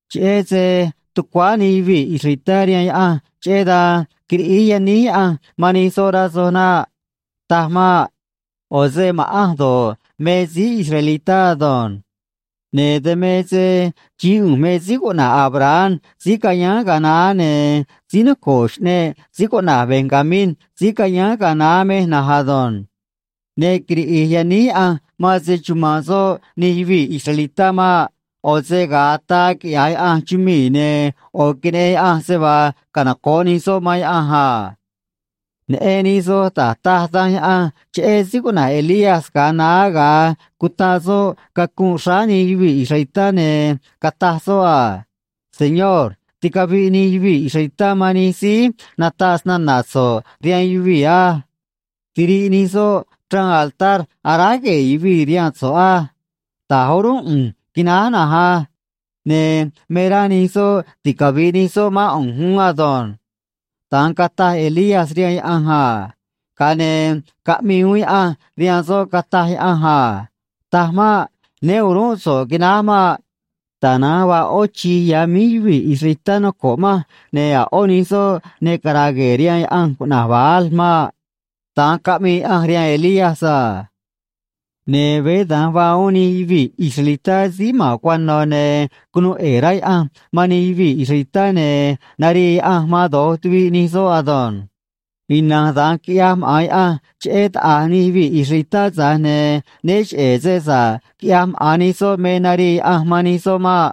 Cheꞌé se tucuáá nij yuvii̱ israelitá rihaan Yaꞌanj, cheꞌé dan quiriꞌíj yaníj Yaꞌanj man nij soꞌ, rá soj naꞌ. Taj maꞌ. ꞌO̱ se ma̱ꞌanj do̱ꞌ me síí israelitá ado̱nj. Ne̱ dan me se xií ꞌu̱nj me síí cuꞌna̱j Abraham, síí cayáán ga̱a naá, ne̱ síí noco̱ꞌ xꞌneꞌ síí cuꞌna̱j Benjamín, síí cayáán ga̱a naá, mej na̱nj ado̱nj. Ne quiriꞌi̱j yaníj Yaꞌanj man se‑chuma̱nꞌ soꞌ nij yuvii̱ israelitá maꞌ. ꞌO̱ se ga̱a ataa quiꞌya̱j Yaꞌanj chumii̱, ne̱ ꞌo̱ queneꞌen Yaꞌanj se vaa canoco̱ꞌ nij soꞌ man Yaꞌanj a. Neꞌen nij soj da̱j taj Danj Yaꞌanj cheꞌé síí cuꞌna̱j Elías ga̱a naá ga̱a cutaꞌ soꞌ cacunꞌ xráá nij yuvii̱ israelitá, ne̱ cataj soꞌ a: “Señor, ticaviꞌ nij yuvii̱ israelitá man nij síí nataꞌ snana̱ so̱ꞌ rihaan yuvii̱ á. Tiriꞌ nij soꞌ chraan altar aráj gue̱e̱ yuvii̱ rihaan so̱ꞌ á. Ta̱j o̱rúnꞌ ꞌu̱nj quináj na̱nj á. Ne̱ me rá nij soꞌ ticavi̱ꞌ nij soꞌ mán ꞌu̱nj uún ado̱nj.” Da̱nj cataj Elías rihaan Yaꞌanj a. Ga̱a ne̱ caꞌmii uún Yaꞌanj rihaan soꞌ, cataj Yaꞌanj a: “Taj maꞌ. Né o̱ruún so̱ꞌ quináj maꞌ. Tana̱nj vaa ꞌó chi̱j ya̱ míj yuvii̱ israelitá noco̱ꞌ manj, ne̱ a̱ ꞌó nij soꞌ ne cara̱a̱ gue̱e̱ rihaan yaꞌanj cuꞌna̱j Baal maꞌ.” Da̱nj caꞌmii Yaꞌanj rihaan Elías a. Ne̱ veé da̱nj vaa uún nij yuvii̱ israelitá síí ma̱n cuano̱, ne̱ cunuu ꞌe̱e̱ rá Yaꞌanj man nij yuvii̱ israelitá, ne̱ narii Yaꞌanj man do̱j tuviꞌ nij soꞌ ado̱nj. Ina̱nj da̱nj quiꞌyaj maꞌa̱n Yaꞌanj cheꞌé taꞌa̱j nij yuvii̱ israelitá, tza̱j ne̱ né cheꞌe̱ se sa̱ꞌ quiꞌyaj maꞌa̱n nij soꞌ me narii Yaꞌanj man nij soꞌ maꞌ.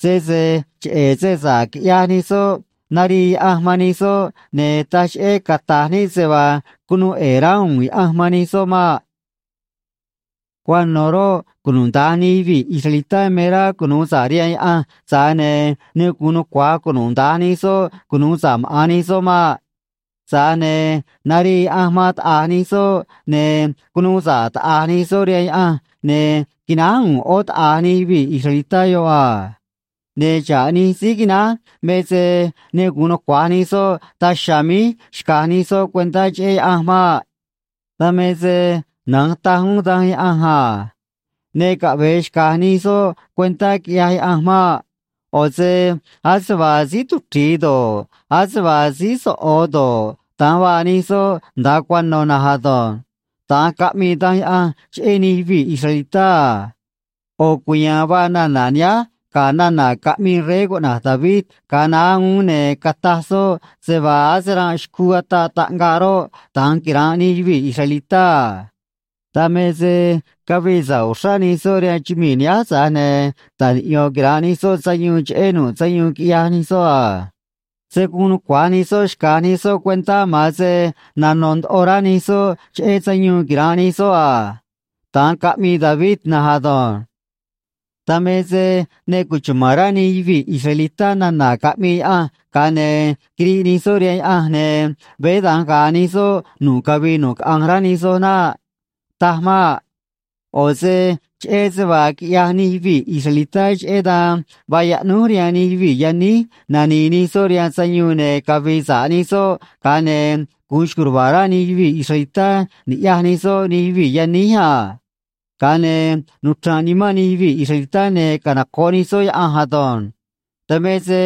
Sese cheꞌe̱ se sa̱ꞌ quiꞌyaj nij soꞌ narii Yaꞌanj man nij soꞌ, ne̱ taj cheꞌé cata̱j níꞌ se vaa cunuu ꞌe̱e̱ rá u̱u̱n Yaꞌanj man nij soꞌ maꞌ. Cuano̱ roꞌ, cunuda̱nj nij yuvii̱ israelitá me rá cunu̱u sa̱ꞌ rihaan Yaꞌanj, tza̱j ne̱ ne gu̱un nucua̱j cunuda̱nj nij soꞌ cunu̱u sa̱ꞌ maꞌa̱n nij soꞌ maꞌ. Tza̱j ne̱ narii Yaꞌanj man taꞌa̱j nij soꞌ, ne̱ cunuu sa̱ꞌ taꞌa̱j nij soꞌ rihaan Yaꞌanj, ne̱ quináj u̱u̱n ꞌó taꞌa̱j nij yuvii̱ israelitá yoꞌ a. Ne̱ xa̱ꞌ nij síí quináj me se ne gu̱un nucua̱j nij soꞌ daj chiha̱a̱ míj xca̱j nij soꞌ cuentá cheꞌé Yaꞌanj maꞌ. Dan me se na̱nj taj uún Danj Yaꞌanj a: “Ne caꞌve̱e xca̱j nij soꞌ cuentá, quiꞌyaj Yaꞌanj maꞌ. ꞌO̱ se ase vaa síí tuchri̱i do̱ꞌ, ase vaa síí soꞌo̱ do̱ꞌ, da̱nj vaa nij soꞌ nda̱a cuano̱ na̱nj ado̱nj.” Da̱nj caꞌmii Danj Yaꞌanj cheꞌé nij yuvii̱ israelitá a. ꞌO̱ cuya̱a̱n vaa nana̱ nihánj ga̱ nana̱ caꞌmii rey cuꞌna̱j David ga̱a naá uún, ne̱ cataj soꞌ se vaa ase ranꞌ xcuu ataꞌ raꞌngaꞌ roꞌ, da̱nj quira̱nꞌ nij yuvii̱ israelitá a. Dan me se cavii sa̱ꞌ uxrá nij soꞌ rihaan chumii̱ nihánj, tza̱j ne̱ ta̱j niꞌyo̱n quira̱nꞌ nij soꞌ sayuun cheꞌé nu̱ꞌ sayuun quiꞌyaj nij soꞌ a. Se̱ guun nucua̱j nij soꞌ xca̱j nij soꞌ cuentá, ma̱an se nano̱ ndoꞌo rá nij soꞌ cheꞌé sayuun quira̱nꞌ nij soꞌ a. Da̱nj caꞌmii David na̱nj ado̱nj. Dan me se ne cuchuma̱n rá nij yuvii̱ israelitá nana̱ caꞌmii Yaꞌanj, ga̱a ne̱ quiriꞌ nij soꞌ rihaan Yaꞌanj, ne̱ veé da̱nj ga̱a̱ nij soꞌ nu̱ꞌ cavii nu̱ꞌ caꞌanj, rá nij soj naꞌ. Taj maꞌ. ꞌO̱ se cheꞌé se vaa quiꞌyaj nij yuvii̱ israelitá, cheꞌé dan vaa yaꞌnúj rihaan nij yuvii̱ yaníj nani̱i̱ nij soꞌ rihaan sayuun ne̱ cavi̱i̱ sa̱ꞌ nij soꞌ, ga̱a ne̱ gu̱un xco̱j ruva̱a̱ rá nij yuvii̱ israelitá ni̱ꞌyaj nij soꞌ nij yuvii̱ yaníj a. Ga̱a ne̱ nuchra̱nꞌ nimán nij yuvii̱ israelitá, ne̱ canoco̱ꞌ nij soꞌ Yaꞌanj ado̱nj. Dan me se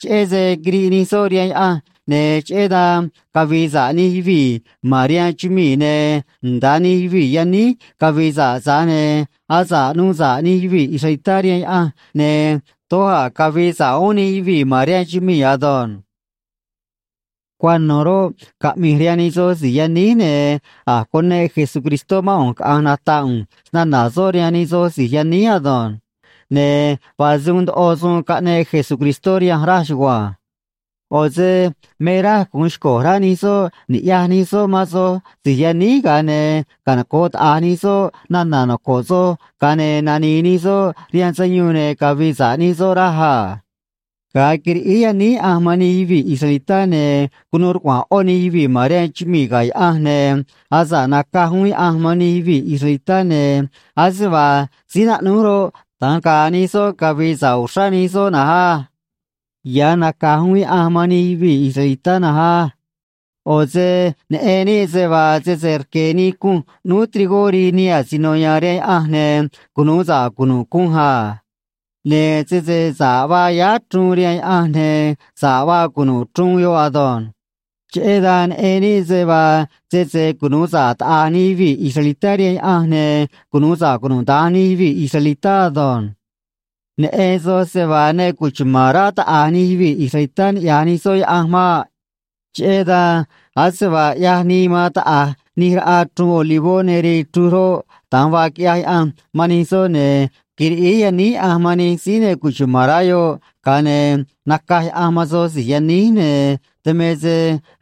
cheꞌé se quiriꞌ nij soꞌ rihaan Yaꞌanj, ne̱ cheꞌé dan cavii sa̱ꞌ nij yuvii̱ ma̱n rihaan chumii̱, ne̱ nda̱a nij yuvii̱ yaníj cavii sa̱ꞌ, tza̱j ne̱ asa̱ꞌ nuu sa̱ꞌ nij yuvii̱ israelitá rihaan Yaꞌanj, ne̱ doj a̱ cavi̱i̱ sa̱ꞌ uún nij yuvii̱ ma̱n rihaan chumii̱ ado̱nj. Cuano̱ roꞌ, caꞌmi̱j rihaan nij soj si̱j yaníj, ne̱ a̱j cuneꞌ Jesucristó mán ꞌu̱nj caꞌa̱nj nata̱ꞌ ꞌu̱nj snana̱ soꞌ rihaan nij soj si̱j yaníj ado̱nj. Ne̱ vaa se uun ndoꞌo suun caꞌneꞌ Jesucristó rihanj, raj chugua̱nj. ꞌO̱ se me raj gu̱un xco̱j rá nij soꞌ ni̱ꞌyaj nij soꞌ man soj si̱j yaníj, ga̱a ne̱ canoco̱ꞌ taꞌa̱j nij soꞌ nana̱ noco̱ꞌ soj, ga̱a ne̱ nani̱i̱ nij soꞌ rihaan sayuun ne̱ cavi̱i̱ sa̱ꞌ nij soꞌ, raj a. Ga̱a quiriꞌíj yaníj Yaꞌanj man nij yuvii̱ israelitá, ne̱ cunuu rcuaꞌa̱a̱n ꞌó nij yuvii̱ ma̱n rihaan chumii̱ ga̱ Yaꞌanj, ne̱ asa̱ꞌ nacaj uún Yaꞌanj man nij yuvii̱ israelitá, ne̱ ase vaa síí naꞌnúj roꞌ, da̱nj ga̱a̱ nij soꞌ, cavi̱i̱ sa̱ꞌ uxrá nij soꞌ na̱nj á. Ya̱ naca̱j uún Yaꞌanj man nij yuvii̱ israelitá na̱nj á. ꞌO̱ se neꞌen níꞌ se vaa sese rque̱ nii cunj ꞌnúú trigó rii nii asino ya̱a̱n rihaan Yaꞌanj, ne̱ cunu̱u sa̱ꞌ cunu̱ꞌ cunj a. Ne̱ sese sa̱ꞌ vaa yáá chruun rihaan Yaꞌanj, ne̱ sa̱ꞌ vaa cunu̱ꞌ chruun yoꞌ ado̱nj. Cheꞌé dan neꞌen níꞌ se vaa sese cunu̱u sa̱ꞌ taꞌa̱j nij yuvii̱ israelitá rihaan Yaꞌanj, ne̱ cunu̱u sa̱ꞌ cunuda̱nj nij yuvii̱ israelitá ado̱nj. Neꞌen soj se vaa ne cuchuma̱n rá taꞌa̱j nij yuvii̱ israelitá ni̱ꞌyaj nij soꞌ Yaꞌanj maꞌ. Cheꞌé dan, ase vaa ꞌyaj nii man taꞌa̱j nij raꞌa chruun olivó ne rii chruj roꞌ, da̱nj vaa quiꞌyaj Yaꞌanj man nij soꞌ, ne̱ quiriꞌíj yaníj Yaꞌanj man nij síí ne cuchuma̱n rá yoꞌ, ga̱a ne̱ nacaj Yaꞌanj man soj si̱j yaníj, ne̱ dan me se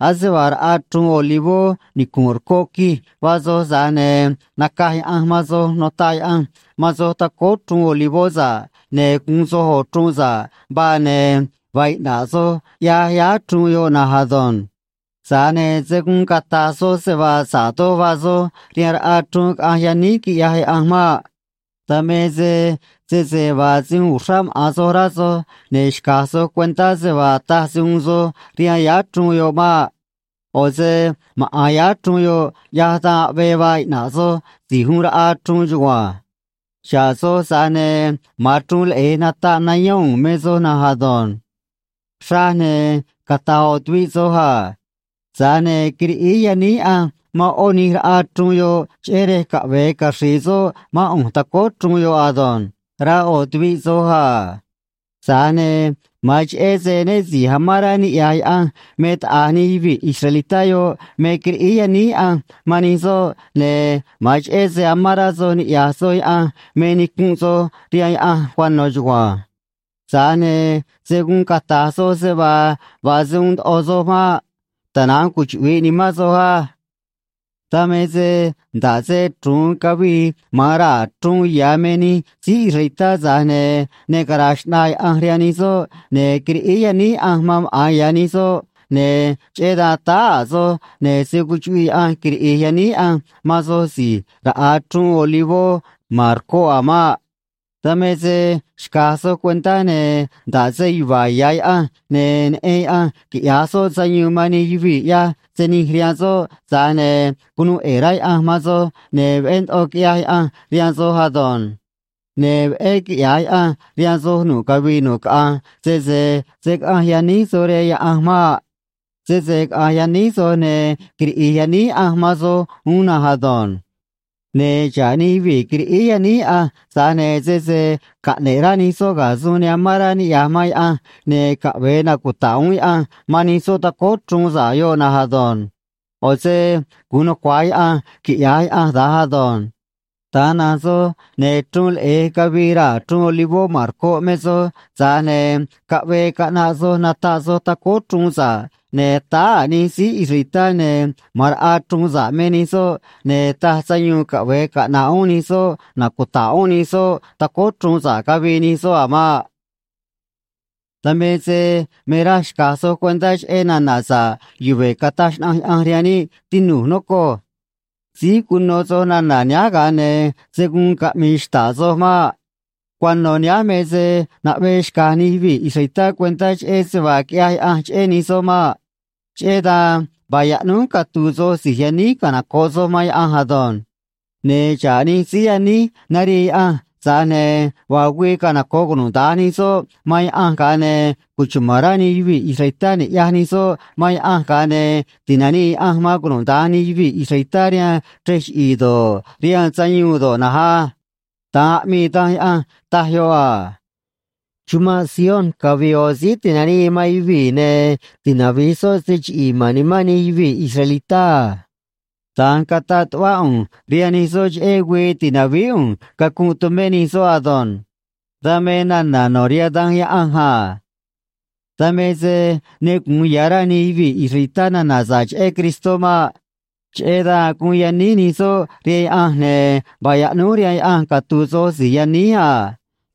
ase vaa raꞌa chruun olivó nicu̱nꞌ rcoꞌ quij vaa soj, tza̱j ne̱ nacaj Yaꞌanj man soj, notaꞌ Yaꞌanj man soj tacóó chruun olivó sa̱ꞌ, ne̱ guun soj ꞌo̱ chruun sa̱ꞌ vaa, ne̱ vaa iꞌna̱ꞌ soj, ꞌyaj yáá chruun yoꞌ na̱nj ado̱nj. Tza̱j ne̱ se̱ guun cata̱j soj se vaa sa̱ꞌ doj vaa soj rihaan raꞌa chruun caꞌanj yaníj quiꞌyaj Yaꞌanj maꞌ. Dan me se sese vaa se uun uxrá maꞌa̱n soj rá soj, ne̱ xca̱j soj cuentá se vaa taj se uun soj rihaan yáá chruun yoꞌ maꞌ. ꞌO̱ se maꞌa̱n yáá chruun yoꞌ ꞌyaj dan aꞌvee vaa iꞌna̱ꞌ soj si̱j uun raꞌa chruun chugua̱nj. Xa̱ꞌ soj, tza̱j ne̱ ma̱an chruun leꞌe̱j nataꞌ nayón u̱u̱n me soj na̱nj ado̱nj. Xraj, ne̱ cata̱j ꞌo̱ tuviꞌ soj a: “Tza̱j ne̱ quiriꞌíj yaníj Yaꞌanj man ꞌó nij raꞌa chruun yoꞌ cheꞌé rej caꞌve̱e caxri̱i̱ soꞌ mán ꞌu̱nj tacóó chruun yoꞌ ado̱nj”, rá ꞌo̱ tuviꞌ soj a. Tza̱j ne̱ ma̱an cheꞌé se né si̱j amán rá niꞌya̱j Yaꞌanj me taꞌa̱j nij yuvii̱ israelitá yoꞌ me quiriꞌíj yaníj Yaꞌanj man nij soꞌ, ne̱ ma̱an cheꞌé se amán rá soj niꞌya̱j soj Yaꞌanj me nicunꞌ soj rihaan Yaꞌanj cuano̱ chugua̱nj. Tza̱j ne̱ se̱ guun cata̱j soj se vaa vaa se uun ndoꞌo soj maꞌ. Tana̱nj cuchuꞌvi̱ꞌ nimán soj á. Dan me se nda̱ꞌ se chru̱un cavii man raa̱ chruun ya̱ me nij síí israelitá, tza̱j ne̱ ne cara̱a̱ xꞌnaa Yaꞌanj rihaan nij soꞌ, ne̱ quiriꞌíj yaníj Yaꞌanj man maꞌa̱n ya̱ nij soꞌ, ne̱ cheꞌé dan táá a̱ soj, ne̱ se̱ cuchuꞌviꞌ Yaꞌanj quiriꞌi̱j yaníj Yaꞌanj man soj si̱j raꞌa chruun olivó ma̱n rcoꞌ a̱ maꞌ. Dan me se xca̱j soj cuentá, ne̱ nda̱ꞌ se yuva̱a̱ ya̱ Yaꞌanj ne̱ neꞌen Yaꞌanj quiꞌya̱j soꞌ sayuun man nij yuvii̱ ꞌyaj se nij rihaan soꞌ, tza̱j ne̱ cunuu ꞌe̱e̱ rá Yaꞌanj man soj, ne̱ veꞌé ndoꞌo quiꞌyaj Yaꞌanj rihaan soj ado̱nj. Ne̱ veꞌé quiꞌya̱j Yaꞌanj rihaan soj nu̱ꞌ cavii nu̱ꞌ caꞌanj, sese se̱ caꞌanj yaníj soj rihaan Yaꞌanj maꞌ. Sese caꞌa̱nj yaníj soj, ne̱ quiriꞌi̱j yaníj Yaꞌanj man soj uún na̱nj ado̱nj. Ne̱ xa̱ꞌ nij yuvii̱ quiriꞌíj yaníj Yaꞌanj, tza̱j ne̱ sese caꞌne̱ꞌ rá nij soꞌ ga̱ suun ne amán rá niꞌya̱j man Yaꞌanj, ne̱ caꞌve̱e nacuta̱ꞌ uún Yaꞌanj man nij soꞌ tacóó chruun sa̱ꞌ yoꞌ na̱nj ado̱nj. ꞌO̱ se gu̱un nucua̱j Yaꞌanj quiꞌya̱j Yaꞌanj da̱nj ado̱nj. Da̱nj na̱nj soj, ne̱ chru̱un leꞌe̱j cavii raa̱ chruun olivó ma̱n rcoꞌ me soj, tza̱j ne̱ caꞌvee caꞌnaꞌ soj nataꞌ soj tacóó chruun sa̱ꞌ, ne̱ táá a̱ nij síí israelitá, ne̱ ma̱an raꞌa chruun sa̱ꞌ me nij soꞌ, ne̱ taj sayuun caꞌve̱e caꞌna̱ꞌ uún nij soꞌ nacuta̱ꞌ uún nij soꞌ tacóó chruun sa̱ꞌ cavii nij soꞌ a̱ maꞌ. Dan me se me raj xca̱j soj cuentá cheꞌé nana̱ sa̱ꞌ yuve̱ cataj xnaꞌanj Yaꞌanj rihaan níꞌ, tinu̱j, nocoj. Síj cuno soj nana̱ nihánj, ga̱a ne̱ se̱ guun caꞌmi̱i̱ xta̱ꞌ soj maꞌ. Cuano̱ nihánj me se naꞌvee xca̱j nij yuvii̱ israelitá cuentá cheꞌé se vaa quiꞌyaj Yaꞌanj cheꞌé nij soꞌ maꞌ. Cheꞌé dan vaa yaꞌnúj catu̱u̱ soj si̱j yaníj canoco̱ꞌ soj man Yaꞌanj ado̱nj. Ne̱ xa̱ꞌ nij síí yaníj narii Yaꞌanj, tza̱j ne̱ vaa güii canoco̱ꞌ cunuda̱nj nij soꞌ man Yaꞌanj, ga̱a ne̱ cuchuma̱n rá nij yuvii̱ israelitá ni̱ꞌyaj nij soꞌ man Yaꞌanj, ga̱a ne̱ ti̱nanii Yaꞌanj man cunuda̱nj nij yuvii̱ israelitá rihaan chrej chiꞌi̱i̱ do̱ꞌ, rihaan sayuun do̱ꞌ na̱nj á. Da̱nj aꞌmii Danj Yaꞌanj, taj yoꞌ a: Chumanꞌ Sion cavi̱i̱ ꞌo̱ síí ti̱nanii man yuvii̱, ne̱ tinavi̱j soꞌ se chiꞌi̱i̱ ma̱n nimán nij yuvii̱ israelitá a. Da̱nj cataꞌ tuꞌvá ꞌu̱nj rihaan nij soꞌ cheꞌé güii ti̱navíí ꞌu̱nj cacunꞌ tumé nij soꞌ ado̱nj. Dan me nana̱ no̱ rihaan Danj Yaꞌanj a. Dan me se ne gu̱un ya̱ rá nij yuvii̱ israelitá nana̱ sa̱ꞌ cheꞌé Cristó maꞌ. Cheꞌé dan guun yaníj nij soꞌ rihaan Yaꞌanj, ne̱ vaa yaꞌnúj rihaan Yaꞌanj catu̱u̱ soj si̱j yaníj a.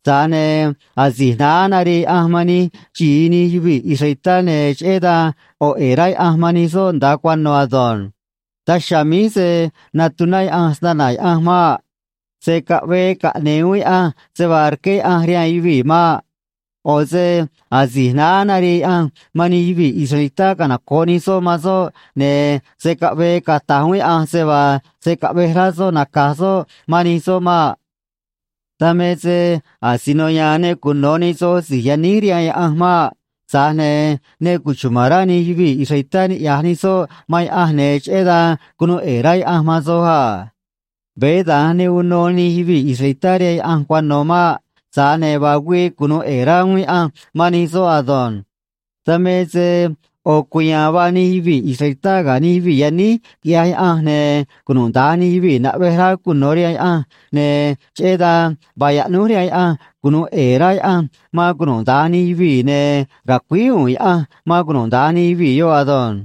Tza̱j ne̱ asi̱j naá narii Yaꞌanj man nij xi̱i nij yuvii̱ israelitá, ne̱ cheꞌé dan ꞌo̱ ꞌe̱e̱ rá Yaꞌanj man nij soꞌ nda̱a cuano̱ ado̱nj. Daj chiha̱a̱ míj se̱ natuná Yaꞌanj snana̱ Yaꞌanj maꞌ. Se̱ caꞌvee caꞌne̱e̱ uún Yaꞌanj se vaa rqué Yaꞌanj rihaan yuvii̱ maꞌ. ꞌO̱ se asi̱j naá narii Yaꞌanj man nij yuvii̱ israelitá canoco̱ꞌ nij soꞌ man soꞌ, ne̱ se̱ caꞌvee cata̱j uún Yaꞌanj se vaa se̱ caꞌvej rá soꞌ naca̱j soꞌ man nij soꞌ maꞌ. Dan me se asino ya̱a̱n ne cuno̱ nij soj si̱j yaníj rihaan Yaꞌanj maꞌ. Tza̱j ne̱ ne cuchuma̱n rá nij yuvii̱ israelitá ni̱ꞌyaj nij soꞌ man Yaꞌanj, ne̱ cheꞌé dan cunuu ꞌe̱e̱ rá Yaꞌanj man soj a. Veé dan ne uno nij yuvii̱ israelitá rihaan Yaꞌanj cuano̱ maꞌ. Tza̱j ne̱ vaa güii cunu̱u ꞌe̱e̱ rá uún Yaꞌanj man nij soꞌ ado̱nj. Dan me se ꞌo̱ cuya̱a̱n vaa nij yuvii̱ israelitá ga̱ nij yuvii̱ yaníj, quiꞌyaj Yaꞌanj, ne̱ cunuda̱nj nij yuvii̱ naꞌvej rá cuno̱ rihaan Yaꞌanj, ne̱ cheꞌé dan vaa yaꞌnúj rihaan Yaꞌanj cunu̱u ꞌe̱e̱ rá Yaꞌanj man cunuda̱nj nij yuvii̱, ne̱ ra̱cuíj u̱u̱n Yaꞌanj man cunuda̱nj nij yuvii̱ yoꞌ ado̱nj.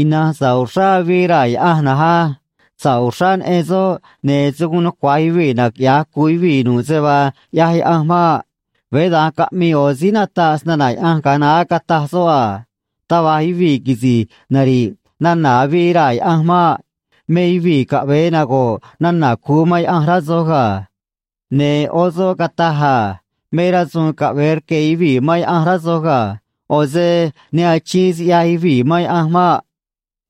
Ina̱nj sa̱ꞌ uxrá avii raa̱ Yaꞌanj na̱nj á. Sa̱ꞌ uxrá neꞌen soꞌ, ne̱ se̱ guun nucua̱j yuvii̱ naquiꞌya̱j cu̱u yuvii̱ nu̱ꞌ se vaa ꞌyaj Yaꞌanj maꞌ. Veé da̱nj caꞌmii ꞌo̱ síí nataꞌ snana̱ Yaꞌanj ga̱a naá, cataj soꞌ a: “Taj va̱j yuvii̱ quisi̱j nari̱ꞌ nana̱ avii raa̱ Yaꞌanj maꞌ. Me yuvii̱ caꞌve̱e nago̱ꞌ nana̱ cu̱u man Yaꞌanj, rá soj ga̱.” Ne̱ ꞌó soꞌ cataj a: “Me rasu̱u̱n caꞌve̱e rque̱ yuvii̱ man Yaꞌanj, rá soj ga̱. ꞌO̱ se ne achiin siꞌyaj yuvii̱ man Yaꞌanj maꞌ.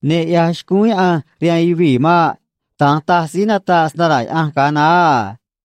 Ne ꞌyaj xcúún Yaꞌanj rihaan yuvii̱ maꞌ.” Da̱nj taj síí nataꞌ snana̱ Yaꞌanj ga̱a naá a.